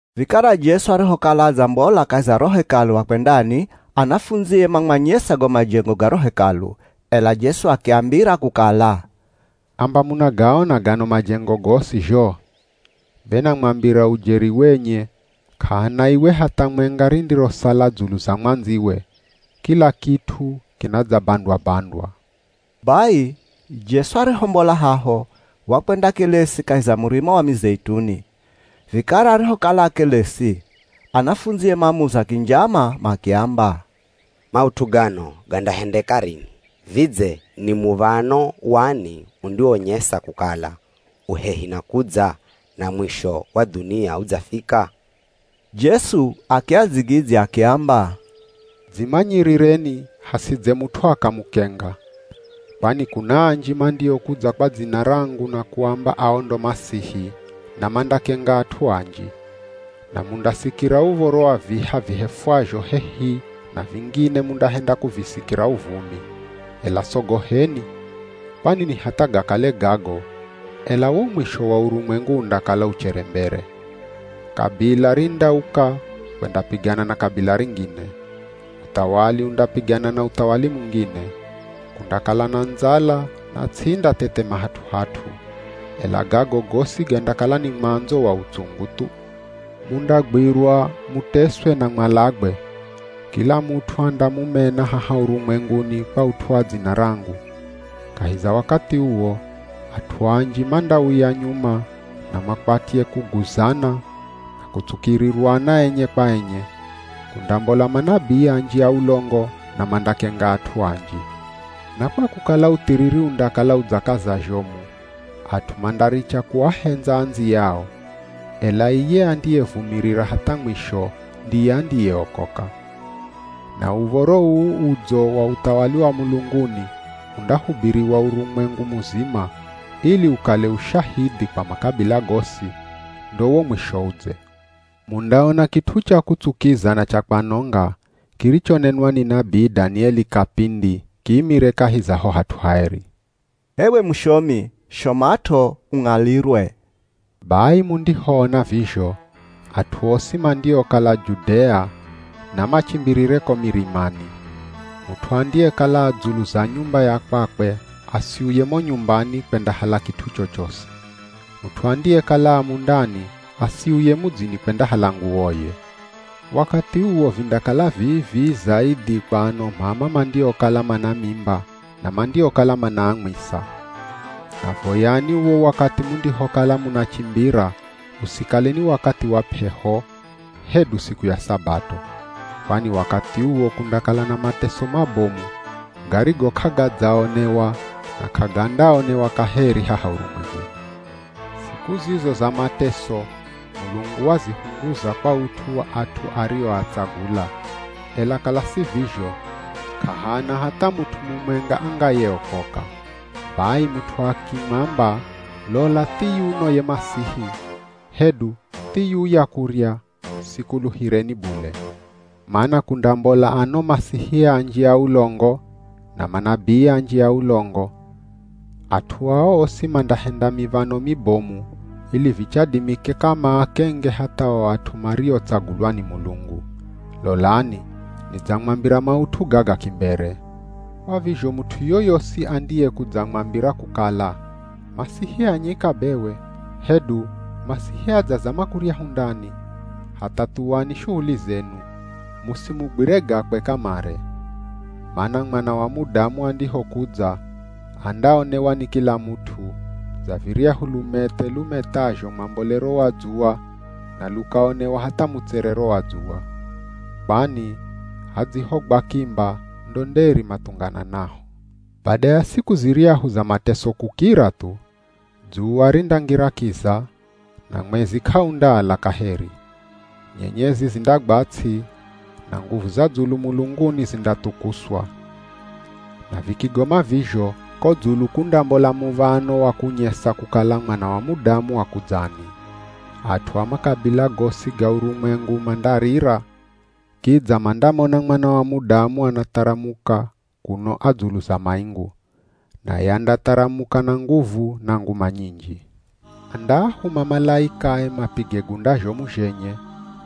Vikara Jesu arihokala adzambola kahi za ro Hekalu akwendani, anafundzie mamwanyesa go majengo ga ro Hekalu. Ela Jesu akiambira kukala, “Amba munagaona gano majengo gosi zho? Be namwambira ujeri wenye k'ahana iwe hatha mwenga rindirosala dzulu za mwandziwe, kila kit'u kinadzabandwa-bandwa.” Bai Jesu arihombola haho, wakwendakelesi kahi za Murima wa Mizeituni. Vikara arihokala akelesi, anafundzie mamuza kinjama makiamba, “Maut'u gano gandahendeka rini? Vidze ni muv̱ano wani undiwonyesa kukala u hehi na kudza na mwisho wa dhunia udzafika?” Jesu akiadzigidzya akiamba, “Dzimanyirireni hasidze mut'u akamukenga. Kwani kuna anji mandiokudza kwa dzina rangu na kuamba ao ndo Masihi, na mandakenga at'u anji. Na mundasikira uv̱oro wa viha vihefwazho hehi na vingine mundahenda kuvisikira uvumi, ela sogoheni, kwani ni hatha gakale gago, ela wo mwisho wa urumwengu undakala uchere mbere. Kabila rindauka kwendapigana na kabila ringine. Uthawali undapigana na uthawali mungine. Kundakala na ndzala na ts'i indathethema hat'u-hat'u. Ela gago gosi gandakala ni mwandzo wa utsungu thu.” “Mundagwirwa muteswe na mwalagwe. Kila mut'u andamumena haha urumwenguni kwa ut'u wa dzina rangu. Kahi za wakathi uwo, at'u anji mandauya nyuma na makwatye kuguzana na kutsukirirwana enye kwa enye. Kundambola manabii anji a ulongo na mandakenga at'u anji. Na kwa kukala uthiriri undakala udzakaza zhomu, at'u mandaricha kuahendza andziyao. Ela iye andiyevumirira hatha mwisho ndiye andiyeokoka. Na Uv̱oro uu Udzo wa uthawali wa mulunguni undahubiriwa urumwengu muzima, ili ukale ushahidhi kwa makabila gosi, ndo wo mwisho udze.” “Mundaona kit'u cha kutsukiza na cha kwanonga, kirichonenwa ni nabii Danieli kapindi, kiimire kahi za ho hat'u haeri. (H'ewe mushomi, shomat'o ung'alirwe.) Bai mundihoona vizho, at'u osi mandiokala Judea namachimbirire ko mirimani. Mut'u andiyekala a dzulu za nyumba ya kwakwe asiuye mo nyumbani kwendahala kit'u chochosi. Mut'u andiyekala a mundani asiuye mudzini kwendahala nguwoye. Wakathi uwo vindakala vii-vii zaidhi kwa ano m'ama mandiokala mana mimba na mandiokala manaamwisa. Na voyani uwo wakathi mundihokala munachimbira, usikale ni wakathi wa p'eho, hedu siku ya Sabato. Kwani wakathi uwo kundakala na mateso mabomu garigo k'agadzaonewa na k'agandaonewa kaheri haha urumwenguni. Siku zizo za mateso Mulungu wazihunguza kwa ut'u wa at'u arioatsagula, ela kala si vizho, k'ahana hatha mut'u mumwenga angayeokoka.” “Bai mut'u akimwamba, ‘Lola thiyuno ye Masihi!’ hedu, ‘Thiyuya kurya,’ sikuluhireni bule. Mana kundambola ano Masihi anji a ulongo, na manabii anji a ulongo. At'u ao osi mandahenda miv̱ano mibomu ili vichadimikika maakenge hatha o at'u mariotsagulwa ni Mulungu. Lolani, nidzamwambira maut'u gaga kimbere.” “Kwa vizho mut'u yoyosi andiyekudzamwambira kukala, ‘Masihi a nyika bewe!’ hedu ‘Masihi adzazama kuryahu ndani!’ hatha thuwani shuhuli zenu, musimugwire gakwe kamare. Mana Mwana wa Mudamu andihokudza, andaonewa ni kila mut'u, dza viryahu lumethe lumethazho mwambolero wa dzuwa na lukaonewa hatha mutserero wa dzuwa. Kwani ‘Hadzihogwa kimba, ndo nderi mathungananaho.’” “Bada ya siku ziryahu za mateso kukira thu, dzuwa rindangira kiza, na mwezi k'aundaala kaheri. Nyenyezi zindagwa ts'i, na nguvu za dzulu mulunguni zindathukuswa. Na vikigoma vizho, ko dzulu kundambola muv̱ano wa kunyesa kukala Mwana wa Mudamu akudzani. At'u a makabila gosi ga urumwengu mandarira, kidza mandamona Mwana wa Mudamu anatharamuka kuno a dzulu za maingu. Naye andatharamuka na nguvu na nguma nyinji. Andaahuma malaikae mapige gunda zhomu zhenye,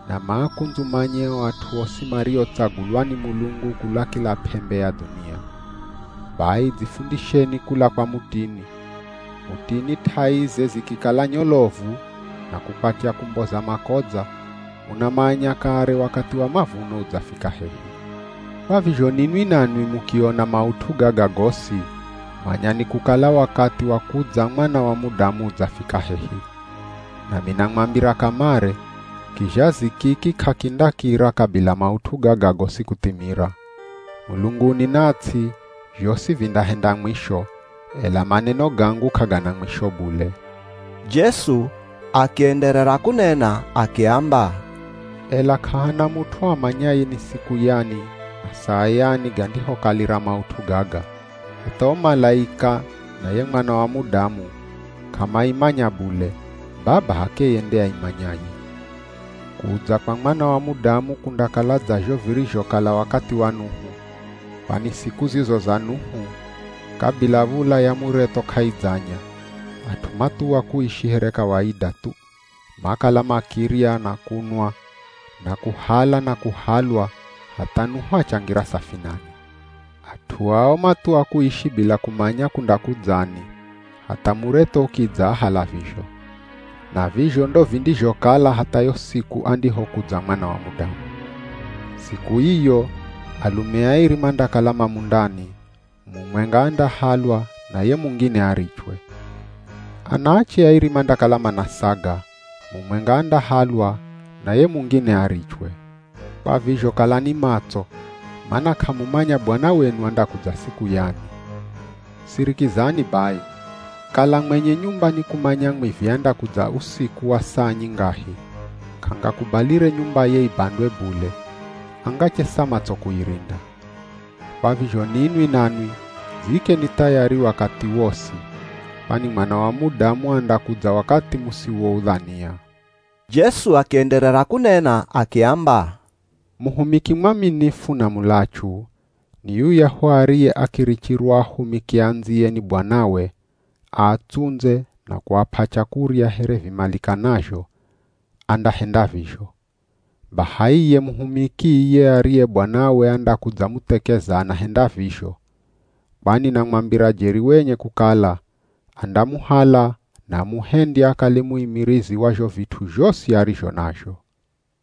na maakundzumanye o at'u osi mariotsagulwa ni Mulungu kula kila p'embe ya dhunia.” “Bai dzifundisheni kula kwa mutini. Mutini t'aize zikikala nyolovu na kukwatya kumboza makodza, munamanya kare wakathi wa mavuno udzafika hehi. Kwa vizho ninwi nanwi mukiona maut'u gaga gosi, manyani kukala wakathi wa kudza Mwana wa Mudamu udzafika hehi. Nami namwambira kamare, kizhazi kiki k'akindakira kabila maut'u gaga gosi kuthimira. Mulunguni na ts'i, zhosi vindahenda mwisho, ela maneno gangu k'agana mwisho bule.” Jesu akienderera kunena akiamba, “Ela k'ahana mut'u amanyaye ni siku yani na saa yani gandihokalira maut'u gaga, hatha o malaika na ye Mwana wa Mudamu k'amaimanya bule, Baba h'akeye nde aimanyaye.” “Kudza kwa Mwana wa Mudamu kundakala dza zho virizhokala wakathi wa Nuhu. Kwani siku zizo za Nuhu kabila v̱ula ya muretho k'aidzanya, at'u mathuwa kuishi here kawaida thu. Makala makirya na kunwa, na kuhala na kuhalwa hatha Nuhu achangira safinani. At'u ao mathuwa kuishi bila kumanya kundakudzani, hatha muretho ukidzaahala vizho. Na vizho ndo vindizhokala hatha yo siku andihokudza Mwana wa Mudamu. Siku iyo alume airi mandakala ma mundani, mumwenga andahalwa na ye mungine arichwe. Anaache airi mandakala manasaga, mumwenga andahalwa na ye mungine arichwe. Kwa vizho, kalani matso, mana k'amumanya Bwana wenu andakudza siku yani. Sirikizani bai, kala mwenye nyumba ni kumanya mwivi andakudza usiku wa saa nyingahi, k'angakubalire nyumbaye ibandwe bule, angachesa matso kuirinda. Kwa vizho ninwi nanwi dziikeni thayari wakathi wosi, kwani Mwana wa Mudamu andakudza wakathi musiwoudhania.” Jesu akienderera kunena akiamba, “Muhumiki mwaminifu na mulachu ni yuyahu ariye akirichirwa ahumiki andziye ni bwanawe aatsundze na kuap'a chakurya here vimalikanazho, andahenda vizho. Baha iye muhumiki iye ariye bwanawe andakudzamuthekeza anahenda vizho. Kwani namwambira jeri wenye kukala, andamuhala na amuhendye akale muimirizi wa zho vit'u zhosi arizho nazho.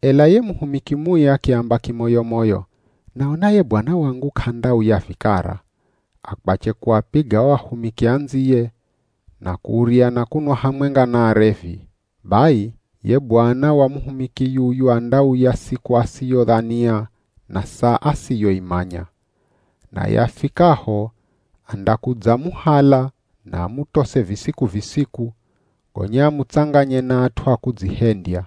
Ela ye muhumiki mui akiamba kimoyo-moyo, ‘Naona ye bwana wangu k'andauya vikara,’ akwache kuapiga o ahumiki andziye, na kurya na kunwa hamwenga na arevi. Bai ye bwana wa muhumiki yuyu andauya siku asiyodhania na saa asiyoimanya. Naye afikaho andakudzamuhala na amutose visiku-visiku, gonya amutsanganye na at'u a kudzihendya.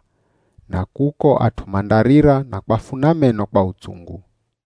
Na kuko at'u mandarira na kwafuna meno kwa utsungu.”